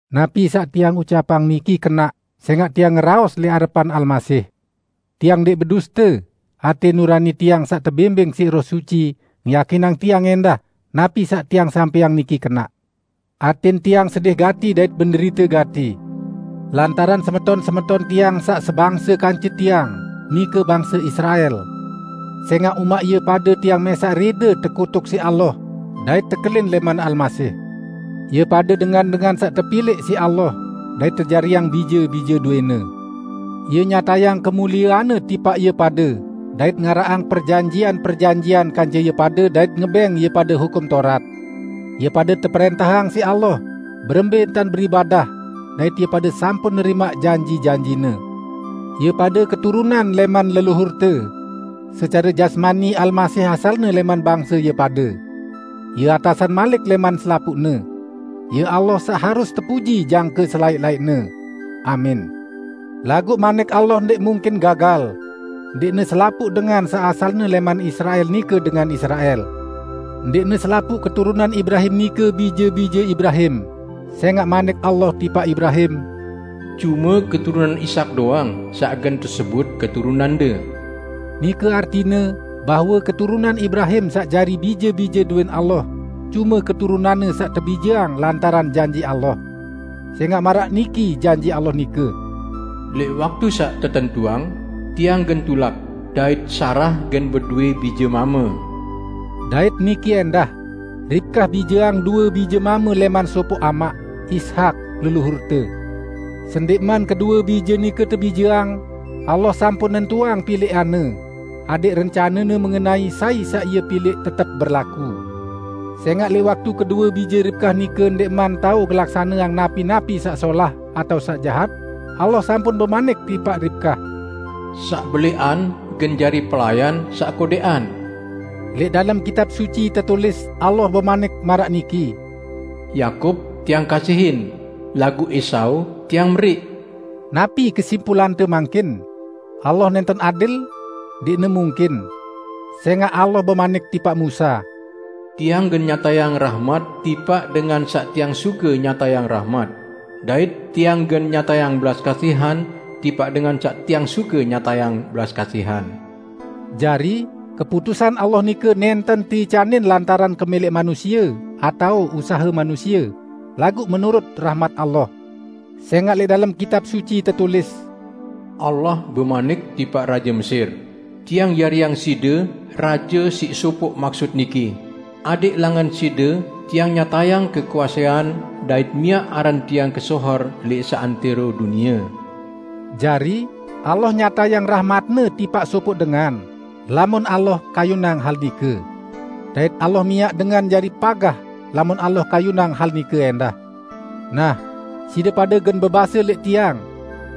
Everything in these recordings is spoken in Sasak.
Napi saq tiang ucapang niki kenaq sẽngaq tiang ngeraos lẽq arepan Almasih. Tiang ndẽq beduste, atẽ nurani tiang saq tebimbing siq Roh Suci ngeyakinang tiang ẽndah napi saq tiang sampẽang niki kenaq. Atẽn tiang sedih gati dait menderite gati lantaran semeton-semeton tiang saq sebangse kance tiang, nike bangse Israel. Sẽngaq umaq ie pade tiang mẽsaq rẽde tekutuk siq Allah dait tekelin lẽman Almasih. Ie pade dengan-dengan saq tepilẽq siq Allah dait tejariang bije-bije dowẽ-Ne, Ie nyatayang kemuliean-Ne tipaq ie pade dait ngaraqang perjanjian-perjanjian kance ie pade dait ngebẽng ie pade Hukum Taurat. Ie pade teprẽntahang siq Allah berembẽ entan beribadah, dait ie pade sampun nerimaq janji-janji-Ne. Ie pade keturunan lẽman leluhurte. Secare jasmani Almasih asalne lẽman bangse ie pade. Ie atasan malik lẽman selapuqne. Ie Allah saq harus tepuji jangke selaẽq-laẽqne. Amin! Laguq Manik Allah ndẽq mungkin gagal; ndẽqne selapuq dengan saq asalne lẽman Israel nike dengan Israel. Ndẽqne selapuq keturunan Ibrahim nike bije-bije Ibrahim, sẽngaq Manik Allah tipaq Ibrahim, "Cume keturunan Ishak doang saq gen tesebut keturunande." Nike artine bahwe keturunan Ibrahim saq jari bije-bije dowẽn Allah cume keturunanne saq tebijeang lantaran janji Allah. Sẽngaq maraq niki janji Allah nike, "Lẽq waktu saq tetentuang, Tiang gen tulak, dait Sarah gen bedowẽ bije mame." Dait niki ẽndah: Ribkah bijeang due bije mame lẽman sopoq amaq, Ishak leluhurte. Sendẽqman kedue bije nike tebijeang, Allah sampun nentuang pilẽqan-Ne, adẽq rencane-Ne mengenai sai saq Ie pilẽq tetep berlaku. Sẽngaq lẽq waktu kedue bije Ribkah nike ndẽqman tao ngelaksaneang napi-napi saq solah atao saq jahat, Allah sampun bemanik tipaq Ribkah, "Saq belẽqan gen jari pelayan saq kodẽqan." Lẽq dalem Kitab Suci tetulis Allah bemanik maraq niki, "Yakub Tiang kasihin laguq Esau Tiang meriq." Napi kesimpulante mangkin? Allah nẽnten adil? Ndẽqne mungkin! Sẽngaq Allah bemanik tipaq Musa, "Tiang gen nyatayang rahmat tipaq dengan saq Tiang suke nyatayang rahmat, dait Tiang gen nyatayang belas kasihan tipaq dengan saq Tiang suke nyatayang belas kasihan." Jari, keputusan Allah nike nẽnten teicanin lantaran kemẽlẽq manusie atao usahe manusie, laguq menurut rahmat Allah. Sẽngaq lẽq dalem Kitab Suci tetulis, "Allah bemanik tipaq raje Mesir, 'Tiang jariang side raje siq sopoq maksut niki, adẽq langan side Tiang nyatayang kekuasean dait miaq aran Tiang kesohor lẽq seantẽro dunie.' " Jari, Allah nyatayang rahmat-Ne tipaq sopoq dengan, lamun Allah kayunang hal nike. Dait Allah miaq dengan jari pagah, lamun Allah kayunang hal nike ẽndah. Nah, side pade gen bebase lẽq tiang,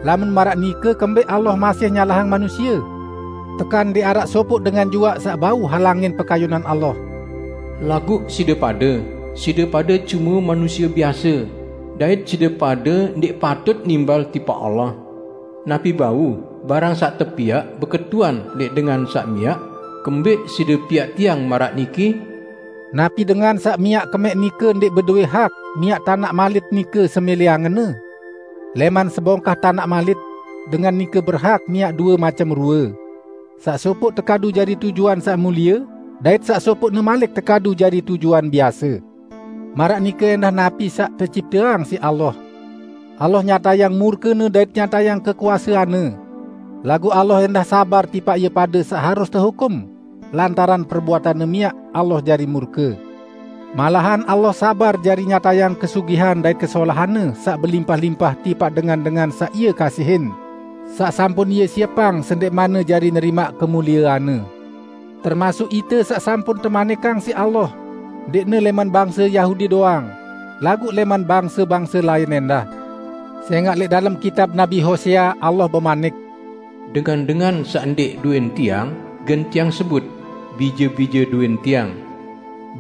"Lamun maraq nike kembẽq Allah masih nyalahang manusie? Tekan ndẽq araq sopoq dengan juaq saq bau halangin pekayunan Allah?" Laguq side pade, side pade cume manusie biase, dait side pade ndẽq patut nimbal tipaq Allah! Napi bau barang saq tepiaq beketuan lẽq dengan saq miaq, "Kembẽq side piaq tiang maraq niki?" Napi dengan saq miaq kemẽq nike ndẽq bedowẽ hak miaq tanaq malit nike semẽlẽ angenne? Lẽman sebongkah tanaq malit, dengan nike berhak miaq due macem rue: Saq sopoq tekadu jari tujuan saq mulie, dait saq sopoqne malik tekadu jari tujuan biase. Maraq nike ẽndah napi saq tecipteang siq Allah. Allah nyatayang murke-Ne dait nyatayang kekuasean-Ne. Laguq Allah ẽndah sabar tipaq ie pade saq harus tehukum lantaran perbuatanne miaq Allah jari murke. Malahan Allah sabar jari nyatayang kesugihan dait kesolahan-Ne saq belimpah-limpah tipaq dengan-dengan saq Ie kasihin, saq sampun Ie siepang sendẽqmanne jari nerimaq kemuliean-Ne, termasuk ite saq sampun temanikang siq Allah, ndẽqne lẽman bangse Yahudi doang, laguq lẽman bangse-bangse lain ẽndah. Sẽngaq lẽq dalem kitab Nabi Hosea, Allah bemanik, "Dengan-dengan saq ndẽq dowẽn Tiang, gen Tiang sebut 'Bije-bije dowẽn Tiang'.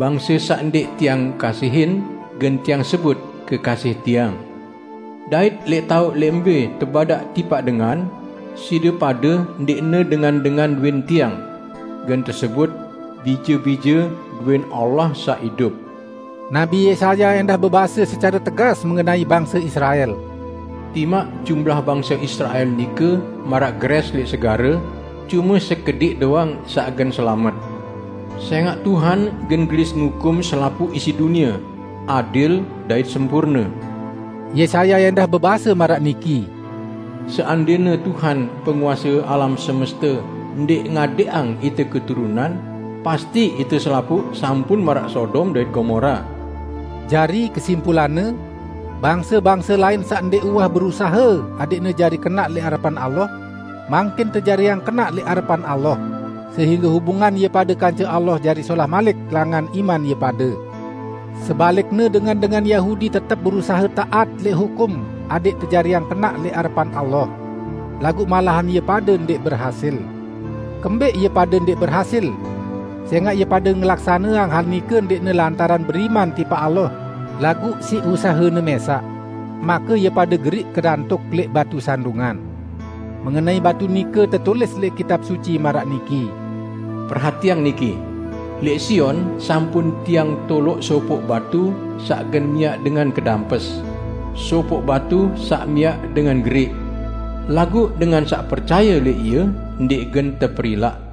Bangse saq ndẽq Tiang kasihin, gen Tiang sebut 'Kekasih Tiang'. Dait lẽq taoq lẽq mbẽ tebadaq tipaq dengan, 'Side pade ndẽqne dengan-dengan dowẽn Tiang', gen tesebut, 'Bije-bije dowẽn Allah saq idup.' " Nabi Yesaya ẽndah bebase secare tegas mengenai bangse Israel, "Timaq jumlah bangse Israel nike maraq gerẽs lẽq segare, cume sekediq doang saq gen selamet; sẽngaq Tuhan gen gelis ngukum selapuq isi dunie, adil dait sempurne." Yesaya ẽndah bebase maraq niki, "Seandẽne Tuhan penguase alam semeste ndẽq ngadẽqang ite keturunan, pasti ite selapuq sampun maraq Sodom dait Gomora." Jari, kesimpulanne: Bangse-bangse lain saq ndẽq uwah berusahe adẽqne jari kenaq lẽq arepan Allah, mangkin tejariang kenaq lẽq arepan Allah sehingge hubungan ie pade kance Allah jari solah malik langan iman ie pade. Sebalikne dengan-dengan Yahudi tetep berusahe taat lẽq hukum adẽq tejariang kenaq lẽq arepan Allah. Laguq malahan ie pade ndẽq berhasil. Kembẽq ie pade ndẽq berhasil? Sẽngaq ie pade ngelaksaneang hal nike ndẽqne lantaran beriman tipaq Allah, laguq siq usahene mẽsaq. Make ie pade geriq kedantuk lẽq "Batu Sandungan". Mengenai batu nike tetulis lẽq Kitab Suci maraq niki, "Perhatiang niki: Lẽq Sion sampun Tiang toloq sopoq batu saq gen miaq dengan kedampes; sopoq batu saq miaq dengan geriq. Laguq dengan saq percaye lẽq Ie, ndẽq gen teperilaq."